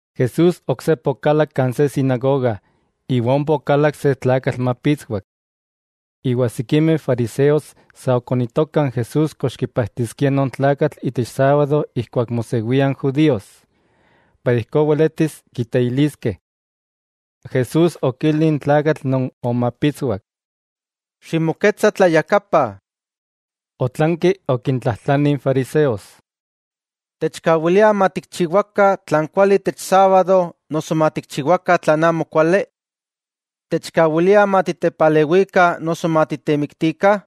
Jesús oksepa okalak kan se sinagoga, iwa ompa okalak se tlakatl mapitswak. Iwa sikimeh fariseos sa okonitokah n Jesús kox kipajtiskia non tlakatl itech sábado ijkuak mosewia n judíos, iwa ijkó weletis kiteiliskeh. Jesús okili n tlakatl non omapitswak: —Ximoketsa tlayakapa. Otlanki okintlajtlani n fariseos: —¿Techkawilia matikchiwakah tlan kuali itech sábado noso matikchiwakah tlan amokuali? ¿Techkawilia matitepalewikah noso matitemiktikah?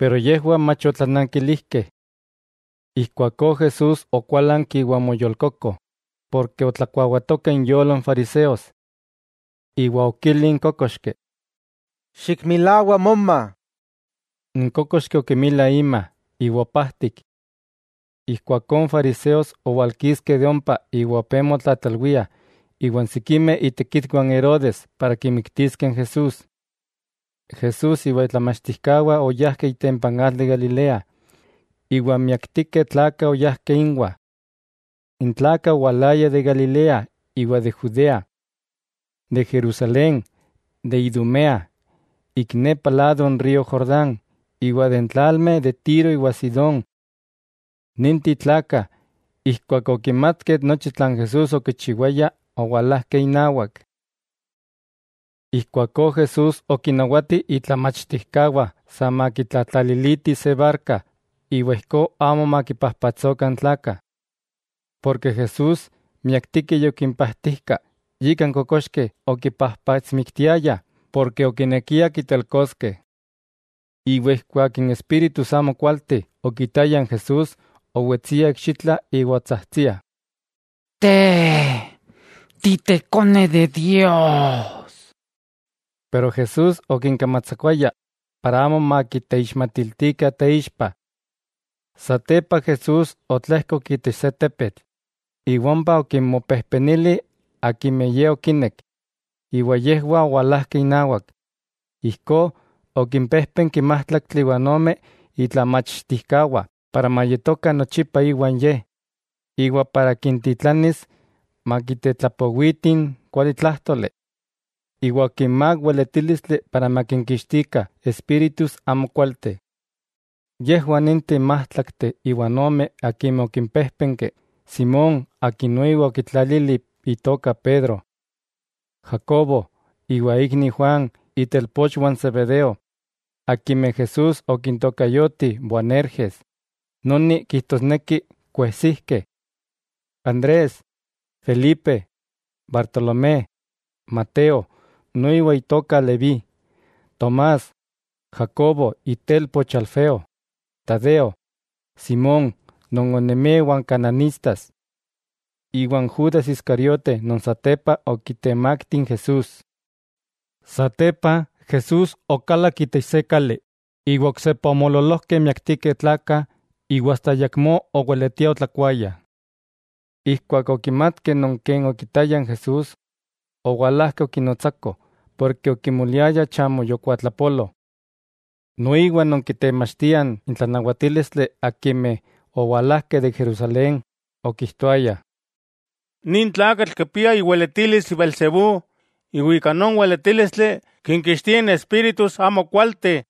Yejwah mach otlanankilijkeh. Ijkuakó Jesús okuálanki iwa omoyolkoko, ken otlakuawatokah inyolo n fariseos. Iwa okili n kókoxki: —Xikmilawa moma. N kókoxki okimila ima, iwa opajtik. Ijkuakó n fariseos owalkiskeh de ompa iwa opé motlatlalwiah iwan sikimeh itekitwah n Herodes para kimiktiskeh n Jesús. Jesús iwa itlamachtijkawah oyajkeh itempa n atl de Galilea, iwa miaktikeh tlakah oyajkeh inwah. N tlakah owalayah de Galilea iwa de Judea, de Jerusalén, de Idumea, ik nepa lado n río Jordán, iwa de n tlalmeh de Tiro iwa Sidón. Ninteh tlakah, ijkuak okimatkeh nochi tlan Jesús okichiwaya, owalajkeh inawak. Ijkuakó Jesús okinnawati itlamachtijkawah sa makitlatlalilitih se barka, iwa ijkó amo makipajpatsokah n tlakah. Porke Jesús miaktikeh yokimpajtijka, yika n kokoxkeh okipajpatsmiktiayah ken okinekiah kitelkoskeh. Iwa ijkuak n espíritus amokualteh okitayah n Jesús, owetsiah ikxitla iwa otsajtsiah: —¡Te, Ti Tekone de Dios! Pero Jesús okinkamatsakuaya para amo makiteixmatiltikah teixpa. Satepa Jesús otlejkok itech se tepetl, iwa ompa okinmopejpenili akimeh Ye okinek, iwa yejwah owalajkeh inawak. Ijkó okimpéjpenki májtlaktli iwa ome itlamachtijkawah para mayetokah nochipa iwan Ye, iwa para kintitlanis makitetlapowitih n kualitlájtoli. Iwa okinmák weletílistli para makinkixtikah espíritus amokualteh. Yejwah ninteh n májtlakteh iwa ome akimeh okimpéjpenki: Simón akin noiwa okitlalili itoka Pedro, Jacobo iwa ikni Juan itelpochwah n Zebedeo, akimeh Jesús okintokayoti Boanerges, noni kijtosneki kuejsijkeh, Andrés, Felipe, Bartolomé, Mateo (noiwa itoka Leví), Tomás, Jacobo itelpoch Alfeo, Tadeo, Simón non onemia iwan Kananistas, iwa n Judas Iscariote non satepa okitemakti n Jesús. Satepa Jesús okalak itech se kali iwa oksepa omoololojkeh miaktikeh tlakah iwa asta ayakmó oweletiah otlakuayah. Ijkuak okimatkeh non ken okitayah n Jesús, owalajkeh okinotsakoh, porke okimoliayah chamo yokuatlapolo. Noiwa non kitemachtiah n tlanawatílistli akimeh owalajkeh de Jerusalén, okijtoayah: —Nin tlakatl kipia iweletilis beelzebú iwa ika non weletílistli kinkixtia n espíritus amokualteh.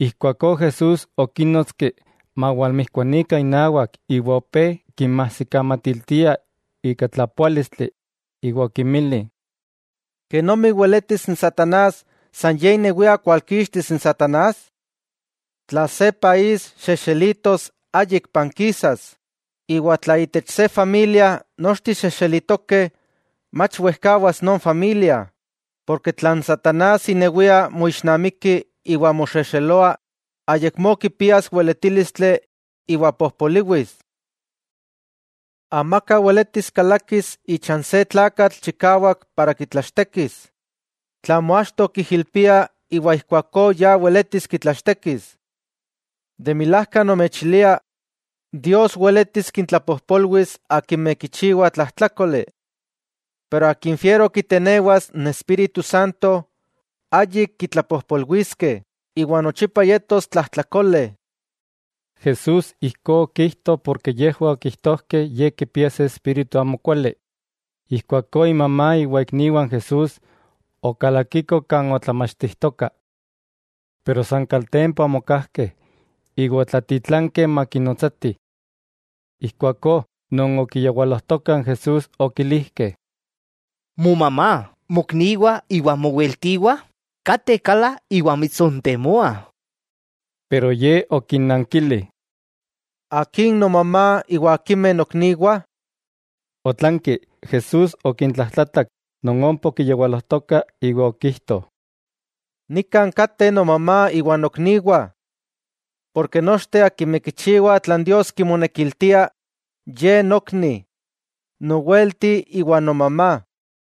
Ijkuakó Jesús okínnotski mawalmijkuanikah inawak iwa opé kinmajsikamatiltia ika tlapoálistli, iwa okinmili: —¿Kenomi weletis n satanás san ye inewia kualkixtis n satanás? Tla se país xexelitos, ayik pankisas, iwa tla itech se familia nochteh xexelitokeh, mach wejkawas non familia. Porke tla n satanás inewia moixnamiki iwa moxexeloa, ayakmó kipias weletílistli iwa pojpoliwis. 'Amaka weletis kalakis icha n se tlakatl chikawak para kitlachtekis, tlamo achto kijilpia iwa ijkuakó ya weletis kitlachtekis. 'De milajka nomechilia Dios weletis kintlapojpolwis akimeh kichiwah tlajtlákoli, pero akin fiero kitenewas n Espíritu Santo, ayik kitlapojpolwiskeh iwa nochipa yetos tlajtlakole. Jesús ijkó okijto porke yejwah okijtojkeh Ye kipia se espíritu amokuali. Ijkuakó imamá iwa ikniwah n Jesús, okalakikoh kan otlamachtijtoka. Pero san kaltempa omokajkeh iwa otlatitlankeh makinotsatih. Ijkuakó, non okiyawalojtokah n Jesús, okilijkeh: —Momamá, mokniwah iwa moweltiwah kateh kala iwa mitsontemoah. Pero Ye okinnankili: —¿Akin nomamá iwa akimeh nokniwah? Otlanki, Jesús okintlajtlatak non ompa okiyawalojtokah iwa okijto: —Nikan kateh nomamá iwa nokniwah, nochteh akimeh kichiwah tlan Dios kimonekiltia, ye nokni, nowelti iwa nomamá.